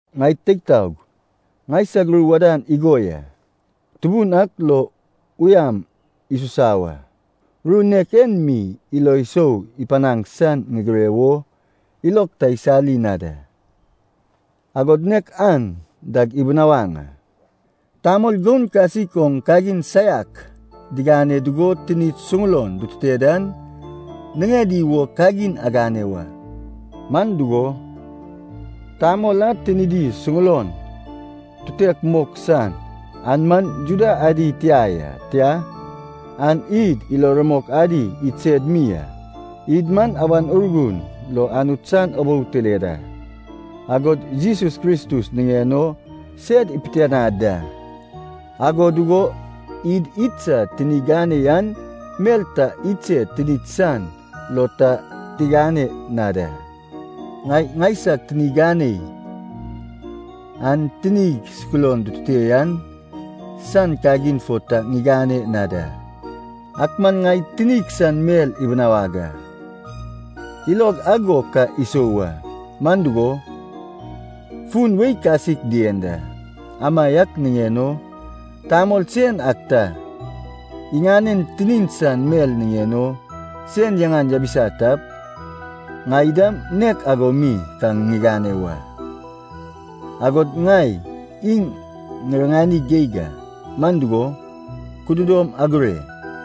Ŋai teig taog, ŋaisag ru wadan igo ya. Tubun ak lo uyam isusa wa. Ru nek en mi ilo sou ipanaŋ san ŋigire wo ilog ta isali na da. Agod nek an dag ibunawaŋ a. Tamol goun kasik oŋ kagin saiak digane dugo tinid suŋulon ditute dan, niŋedi wo kagin agane wa. Man dugo, tamol a tinidi suŋulon tutek mok san, an man Juda adi tia ya, tia, an id ilo rumok adi idsed mi a. Id man Awan Urgun lo Anut san ubou tile da, agod Jesus Kristus niŋen o sed ipitianad da. Ago dugo id idsad tini ganei an mel ta idsed tinid san lo ta tigane na da. Ŋai ŋaisag tini ganei an tinig suŋulon dutute yan san kagin fo ta ŋigane na da. Ak man ŋai tinig san mel ibinawag a, ilog ago ka isou wa, man dugo, fun wei kasik dien da. Amaiak niŋen o, tamol sen ak ta iŋanen tinin san mel niŋen o sen yaŋan yabisa tap, ŋai dam nek ago mi ka ŋigane wa, agod ŋai iŋ ŋiriŋani geig a. Man dugo, kududom agure: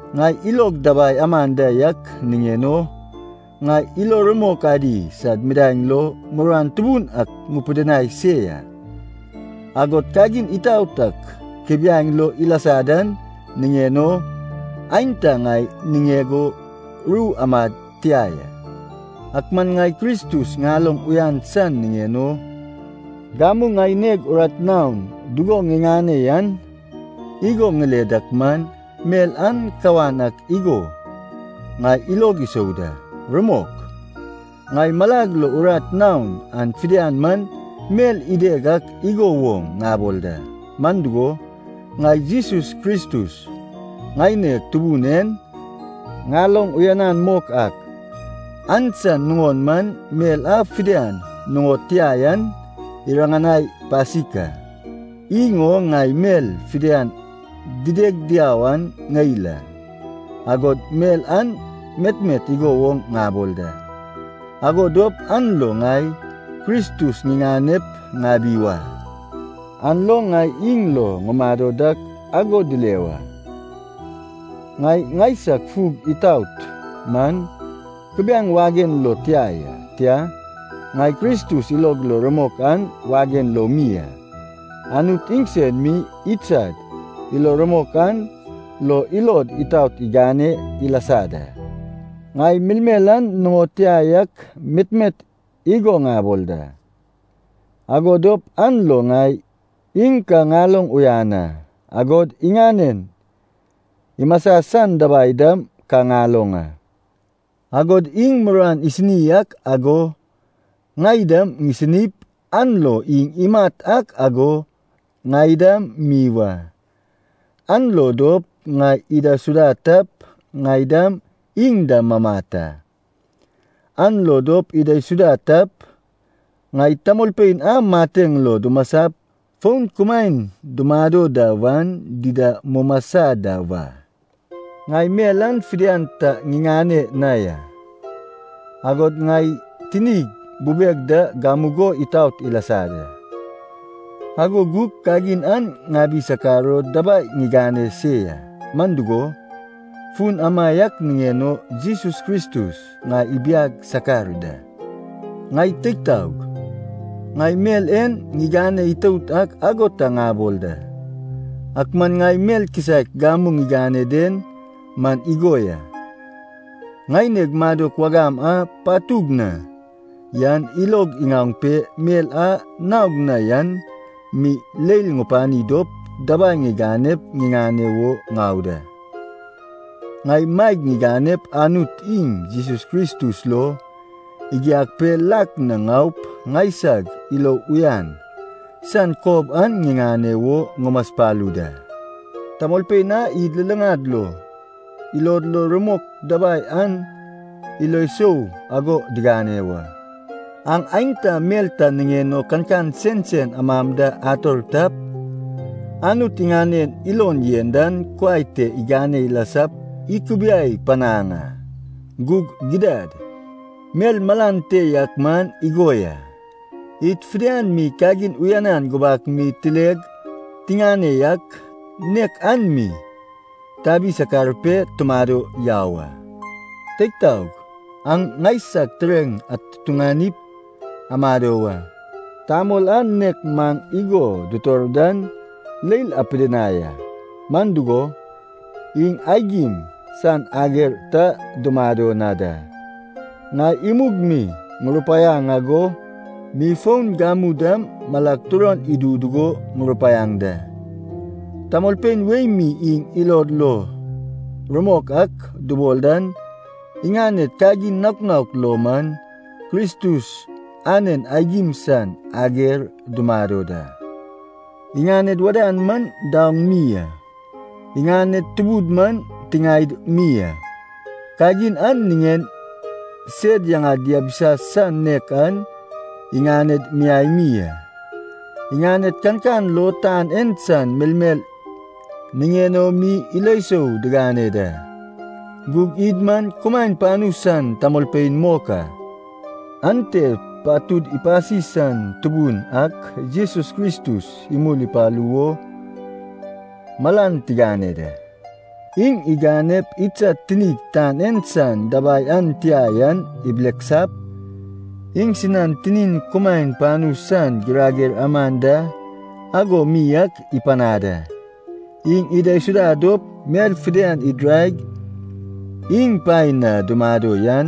Ŋai ilog dabai aman da yak niŋen o, ŋai ilo rumok adi sad midaeŋ lo muruan tubun ak ŋupidinai se ya. Agod kagin itaot ak kubiaeŋ lo ilasa dan niŋen o, aenta ŋai niŋeg o ru amad tia ya. Ak man ŋai Kristus ŋaloŋ uyan san niŋen o gamu ŋaineg urat naon dugo ŋiŋane yan igo ŋile dak man, mel an kawan ak igo ŋai ilog isou da. Rumok, ŋai malag lo urat naon an fidian man mel ideg ak igo woŋ ŋabol da. Man dugo, ŋai Jesus Kristus ŋaineg Tubun en ŋaloŋ uyanan mok ak, an san nuŋon man mel a fidian nuŋod tia yan iriŋanai pasik a. Iŋ o ŋai mel fidian dideg diau an ŋeil a, agod mel an metmet igo ŋabol da, ago dop an lo ŋai Kristus ŋiŋanep ŋabi wa. An lo ŋai iŋ lo ŋumado dak ago dile wa. Ŋai ŋaisag fug itaot man kubiaeŋ wagen lo tia ya, tia, ŋai Kristus ilog lo rumok an wagen lo mi a. Anut iŋsen mi idsad ilo rumok an lo ilod itaot igane ilasa da. Ŋai melmel an nuŋod tia yak metmet igo ŋabol da, ago dop an lo ŋai iŋ ka ŋaloŋ uyan a, agod iŋanen imasa san dabai dam ka ŋaloŋ a. Agod iŋ muruan isini ak ago ŋai dam ŋisinip, an lo iŋ imat ak ago ŋai dam mi wa. An lo dop, ŋai idaisuda tap, ŋai dam iŋ da mamat a. An lo dop idaisuda tap, ŋai tamolpein a mateŋ lo dumasap fon kumaen dumado da wan dida mumasa da wa. Ŋai mel an fidian ta ŋiŋane na ya, agod ŋai tinig bubeg da gamugo itaot ilasa da. Ago gug kagin an ŋabi sakar o dabai ŋigane se ya, man dugo, fun amaiak niŋen o Jesus Kristus ŋai ibiag sakar da. Ŋai teig taog, ŋai mel en ŋigane itout ak ago ta ŋabol da. Ak man ŋai mel kisaek gamu ŋigane den man igo ya, ŋaineg madok wagam a patug na yan ilog iŋaoŋ pe mel a naog na yan mi leil ŋupani dop dabai ŋiganep ŋiŋane wo ŋau da. Ŋai maeg ŋiganep Anut iŋ Jesus Kristus lo igiag pe lak na ŋaup ŋaisag ilo uyan san kob an ŋiŋane wo ŋumaspalu da. Tamolpein a id luluŋad lo ilod lo rumok dabai an ilo sou ago digane wa. Aŋ aenta mel ta niŋen o kankan sensen amam da ator tap, Anut iŋanen ilon yen dan kuai te igane ilasap ikubiai panaŋ a. Gug gidad, mel malan te yak man igo ya, id fidian mi kagin uyanan gubak mi tileg tiŋane yak, nek an mi tabi sakar pe tumado yau a. Teig taog, aŋ ŋaisag tureŋ atutuŋanip amado wa. Tamol a nek maŋ igo dutor dan leil apidinai a, man dugo, iŋ aigim san ager ta dumado na da. Ŋai imug mi ŋurupaiaŋ ago mi fon gamu dam malag turon idu dugo ŋurupaiaŋ da. Tamolpein wei mi iŋ ilod lo rumok ak dubol dan iŋaned kagin naok naok lo man Kristus anen aigim san ager dumado da. Iŋaned wadan man daoŋ mi a. Iŋaned tubud man tiŋaed mi a. Kagin a niŋen sed yaŋad diabisa san nek an iŋaned miai mi a. Iŋaned kankan lo tan en san melmel niŋen o mi ilo sou digane da. Gug id man kumaen panu san tamolpein mok a. Ante patud ipasi san Tubun ak Jesus Kristus imul ipalu o malan tigane da. Iŋ iganep idsad tinid tan en san dabai an tia yan ibileksap, iŋsinan tinin kumaen panu san girager aman da ago mi ak ipanad a. Iŋ idaisuda dop mel fidian idiraig iŋ paen na dumado yan,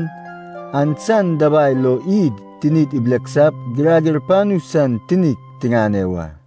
an san dabai lo id tinid ibileksap girager panu san tinik tiŋane wa.